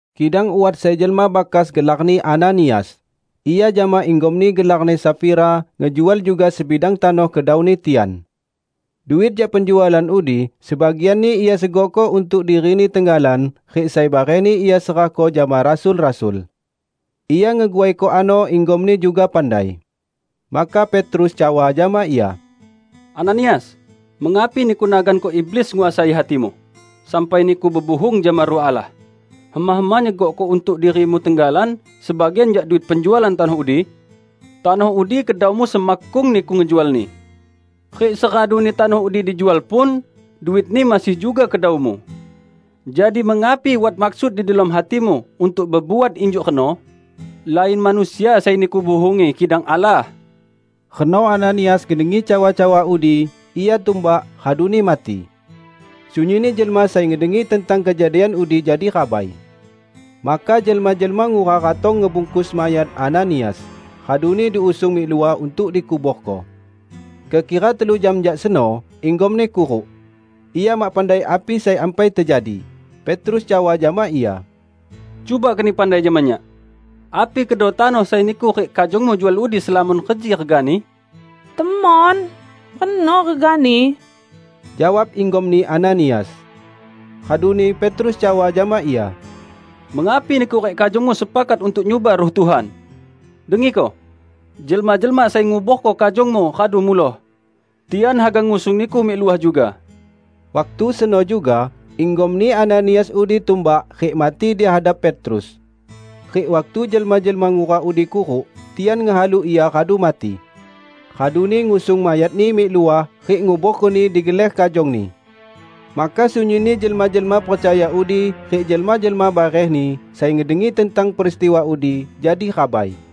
Kidang wat sai jelma bakas gelarni Ananias. Ia jama inggomni gelarni Safira, ngejual juga sebidang tanoh kedauni tian. Duit jak penjualan udi sebagianni ia segokko untuk dirini tenggalan rik sai barehni ia serahko jama rasul-rasul. Ia ngeguaiko ano inggomni juga pandai. Maka Petrus cawa jama ia, "Ananias, mengapi niku naganko iblis nguasai hatimu, sampai niku bebuhung jama Ruh Allah, hema-hema nyegokko untuk dirimu tenggalan sebagian jak duit penjualan tanoh udi? Tanoh udi kedaumu semakkung niku ngejualni. Rik seraduni tanoh udi dijual pun, duitni masih juga kedaumu. Jadi mengapi wat maksud di delom hatimu untuk bebuat injuk reno? Lain manusia sai niku buhungi kidang Allah!" Reno Ananias ngedengi cawa-cawa udi, ia tumbak, raduni mati. Sunyinni jelma sai ngedengi tentang kejadian udi jadi rabai. Maka jelma-jelma ngura ratong ngebungkus mayat Ananias, raduni diusung mik luah untuk dikuborko. Kekira telu jam jak seno, inggomni kuruk. Ia mak pandai api sai ampai tejadi. Petrus cawa jama ia, "Cuba keni pandai jama nyak: Api kedo tanoh sai niku rik kajongmu jual udi, selamon reji regani?" "Temon, reno regani," jawab inggomni Ananias. Raduni Petrus cawa jama ia, "Mengapi niku rik kajongmu sepakat untuk nyuba Ruh Tuhan? Dengiko! Jelma-jelma sai nguborko kajongmu radu muloh. Tian haga ngusung niku mik luah juga." Waktu seno juga inggomni Ananias udi tumbak rik mati di hadap Petrus. Rik waktu jelma-jelma ngura udi kuruk, tian ngehalu ia radu mati. Raduni ngusung mayatni mik luah rik nguborkoni digeler kajongni. Maka sunyinni jelma-jelma percaya udi rik jelma-jelma barehni, sai ngedengi tentang peristiwa udi, jadi rabai.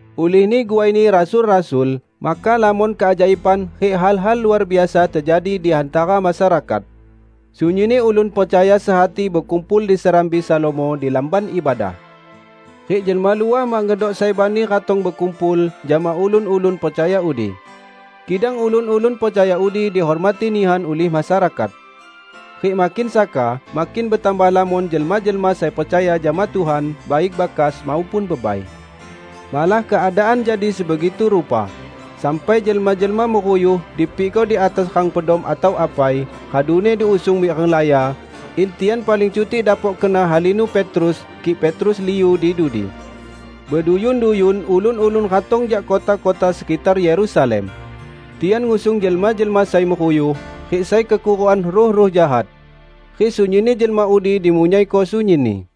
Ulihni guaini rasul-rasul maka lamon keajaiban rik hal-hal luar biasa tejadi di hantara masyarakat. Sunyinni ulun percaya sehati bekumpul di Serambi Salomo di Lamban Ibadah. Rik jelma luah mak ngedok sai bani ratong bekumpul jama ulun-ulun percaya udi. Kidang ulun-ulun percaya udi dihormati nihan ulih masyarakat. Rik makin saka makin betambah lamon jelma-jelma sai percaya jama Tuhan -- baik bakas maupun bebai. Malah keadaan jadi sebegitu rupa, sampai jelma-jelma meruyuh dipikko di atas rang pedom atau apai, raduni diusung mik renglaya, in tian paling cutik dapok kena halinu Petrus, kik Petrus liu di dudi. Beduyun-duyun ulun-ulun ratong jak kota-kota sekitar Yerusalem. Tian ngusung jelma-jelma sai meruyuh, rik sai kekurukan ruh-ruh jahat. Rik sunyinni jelma udi dimunyaiko sunyinni.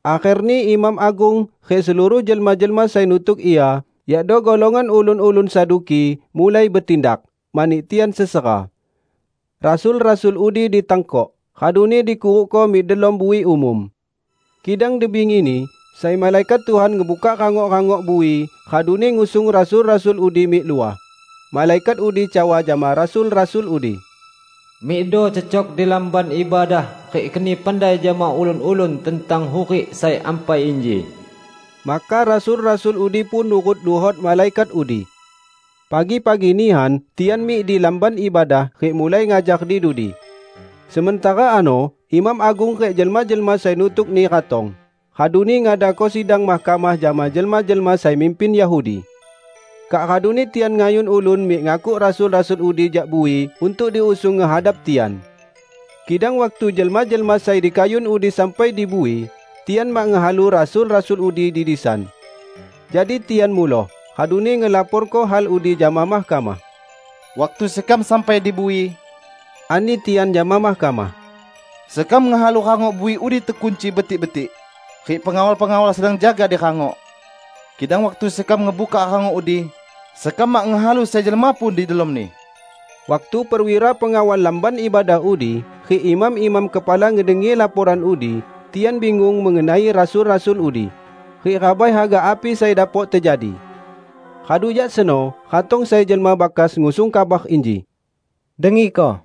Akherni imam agung rik seluruh jelma-jelma sai nutuk ia, yakdo golongan ulun-ulun Saduki, mulai betindak, mani tian sesera. Rasul-rasul udi ditangkok, raduni dikurukko mik delom bui umum. Kidang di bingini, sai malaikat Tuhan ngebukak rangok-rangok bui, raduni ngusung rasul-rasul udi mik luah. Malaikat udi cawa jama rasul-rasul udi, "Mikdo cecok di Lamban Ibadah rik keni pandai jama ulun-ulun tentang hurik sai ampai inji." Maka rasul-rasul udi pun nurut luhot malaikat udi. Pagi-pagi nihan tian mik di Lamban Ibadah rik mulai ngajar di dudi. Sementara ano imam agung rik jelma-jelma sai nutukni ratong, raduni ngadako sidang mahkamah jama jelma-jelma sai mimpin Yahudi. Kak raduni tian ngayun ulun mik ngakuk rasul-rasul udi jak bui untuk diusung ngehadap tian. Kidang waktu jelma-jelma sai dikayun udi sampai di bui, tian mak ngehalu rasul-rasul udi di disan. Jadi tian muloh, raduni ngelaporko hal udi jama mahkamah. "Waktu sekam sampai di bui," ani tian jama mahkamah, "sekam ngehalu rangok bui udi tekunci betik-betik, rik pengawal-pengawal sedang jaga di rangok. Kidang waktu sekam ngebukak rangok udi, sekam mak ngehalu sai jelma pun di delomni." Waktu perwira pengawal Lamban Ibadah udi rik imam-imam kepala ngedengi laporan udi, tian bingung mengenai rasul-rasul udi, rik rabai haga api sai dapok tejadi. Radu jak seno ratong sai jelma bakas ngusung kabar inji, "Dengiko!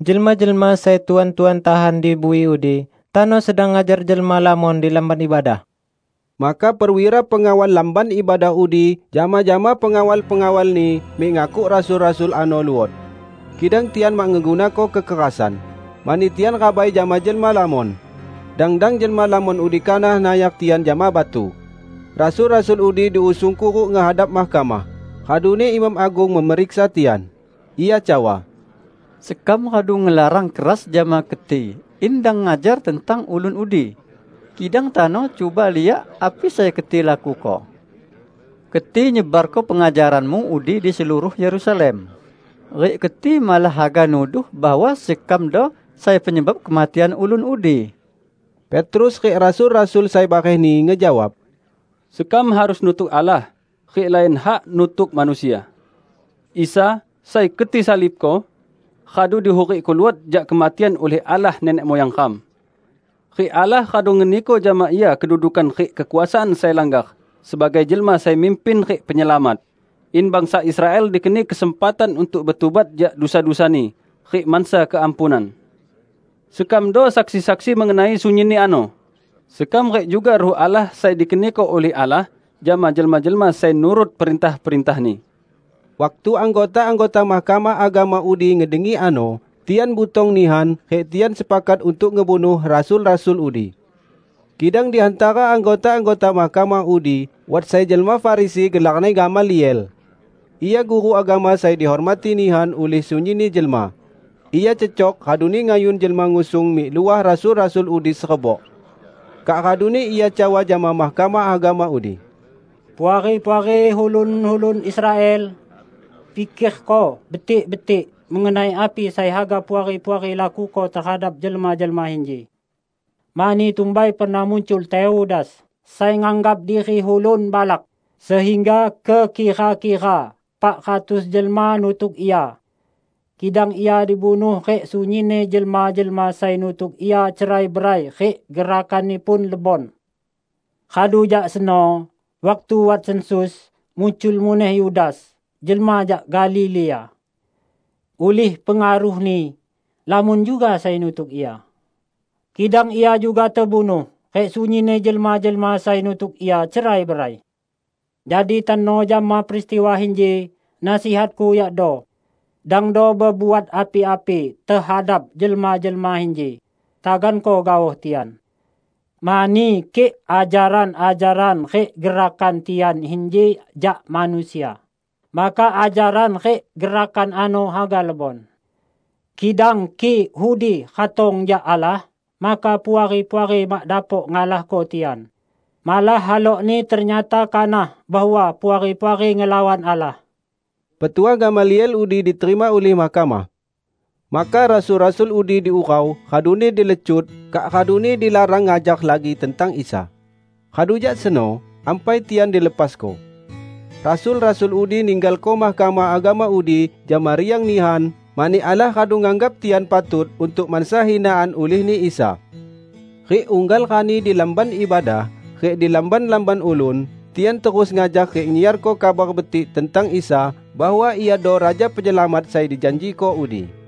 Jelma-jelma sai Tuan-tuan tahan di bui udi tano sedang ngajar jelma lamon di Lamban Ibadah!" Maka perwira pengawal Lamban Ibadah udi jama-jama pengawal-pengawalni mik ngakuk rasul-rasul ano luot. Kidang tian mak ngegunako kekerasan, mani tian rabai jama jelma lamon; dang-dang jelma lamon udi kanah nayar tian jama batu. Rasul-rasul udi diusung kuruk ngehadap mahkamah. Raduni imam agung memeriksa tian. Ia cawa, "Sekam radu ngelarang keras jama keti in dang ngajar tentang Ulun udi. Kidang tano cuba liak api sai keti lakuko! Keti nyebarko pengajaranmu udi di seluruh Yerusalem, rik keti malah haga nuduh bahwa sekamdo sai penyebab kematian Ulun udi." Petrus rik rasul-rasul sai barehni ngejawab, "Sekam harus nutuk Allah rik lain hak nutuk manusia. Isa, sai keti salibko, radu dihurikko luot jak kematian ulih Allah nenek muyang ram. Rik Allah radu ngeniko jama Ia kedudukan rik kekuasaan sai langgar sebagai Jelma Sai Mimpin rik Penyelamat; in bangsa Israel dikeni kesempatan untuk betubat jak dusa-dusani rik mansa keampunan. Sekamdo saksi-saksi mengenai sunyinni ano -- sekam rik juga Ruh Allah sai dikeniko ulih Allah jama jelma-jelma sai nurut perintah-perintah-Ni." Waktu anggota-anggota Mahkamah Agama udi ngedengi ano, tian butong nihan, rik tian sepakat untuk ngebunuh rasul-rasul udi. Kidang di hantara anggota-anggota mahkamah udi wat sai jelma Farisi gelarni Gamaliel. Ia guru agama sai dihormati nihan ulih sunyinni jelma. Ia cecok raduni ngayun jelma ngusung mik luah rasul-rasul udi serebok. Kak raduni ia cawa jama Mahkamah Agama udi, "Puari-puari ulun-ulun Israel! Pikerko betik-betik mengenai api sai haga Puari-puari lakuko tehadap jelma-jelma inji. Mani tumbai pernah muncul Teudas, sai nganggap diri ulun balak, sehingga kekira-kira epak ratus jelma nutuk ia. Kidang ia dibunuh rik sunyinni jelma-jelma sai nutuk ia cerai-berai rik gerakanni pun lebon. Radu jak seno, waktu wat sensus, muncul muneh Yudas, jelma jak Galilea. Ulih pengaruhni, lamon juga sai nutuk ia. Kidang ia juga tebunuh, rik sunyinni jelma-jelma sai nutuk ia cerai-berai. Jadi tano jama peristiwa inji, nasihatku yakdo: dangdo bebuat api-api tehadap jelma-jelma inji, taganko gaoh tian. Mani kik ajaran-ajaran rik gerakan tian inji jak manusia, maka ajaran rik gerakan ano haga lebon. Kidang kik udi ratong jak Allah, maka Puari-puari mak dapok ngalahko tian. Malah halokni ternyata kanah bahwa Puari-puari ngelawan Allah." Petuah Gamaliel udi diterima ulih mahkamah. Maka rasul-rasul udi diurau, raduni dilecut, kak raduni dilarang ngajar lagi tentang Isa. Radu jak seno, ampai tian dilepasko. Rasul-rasul udi ninggalko Mahkamah Agama udi jama riang nihan mani Allah radu nganggap tian patut untuk mansa hinaan ulihni Isa. Rik unggal rani di Lamban Ibadah rik di lamban-lamban ulun, tian terus ngajar rik nyiarko Kabar Betik tentang Isa bahwa Iado Raja Penyelamat sai dijanjiko udi.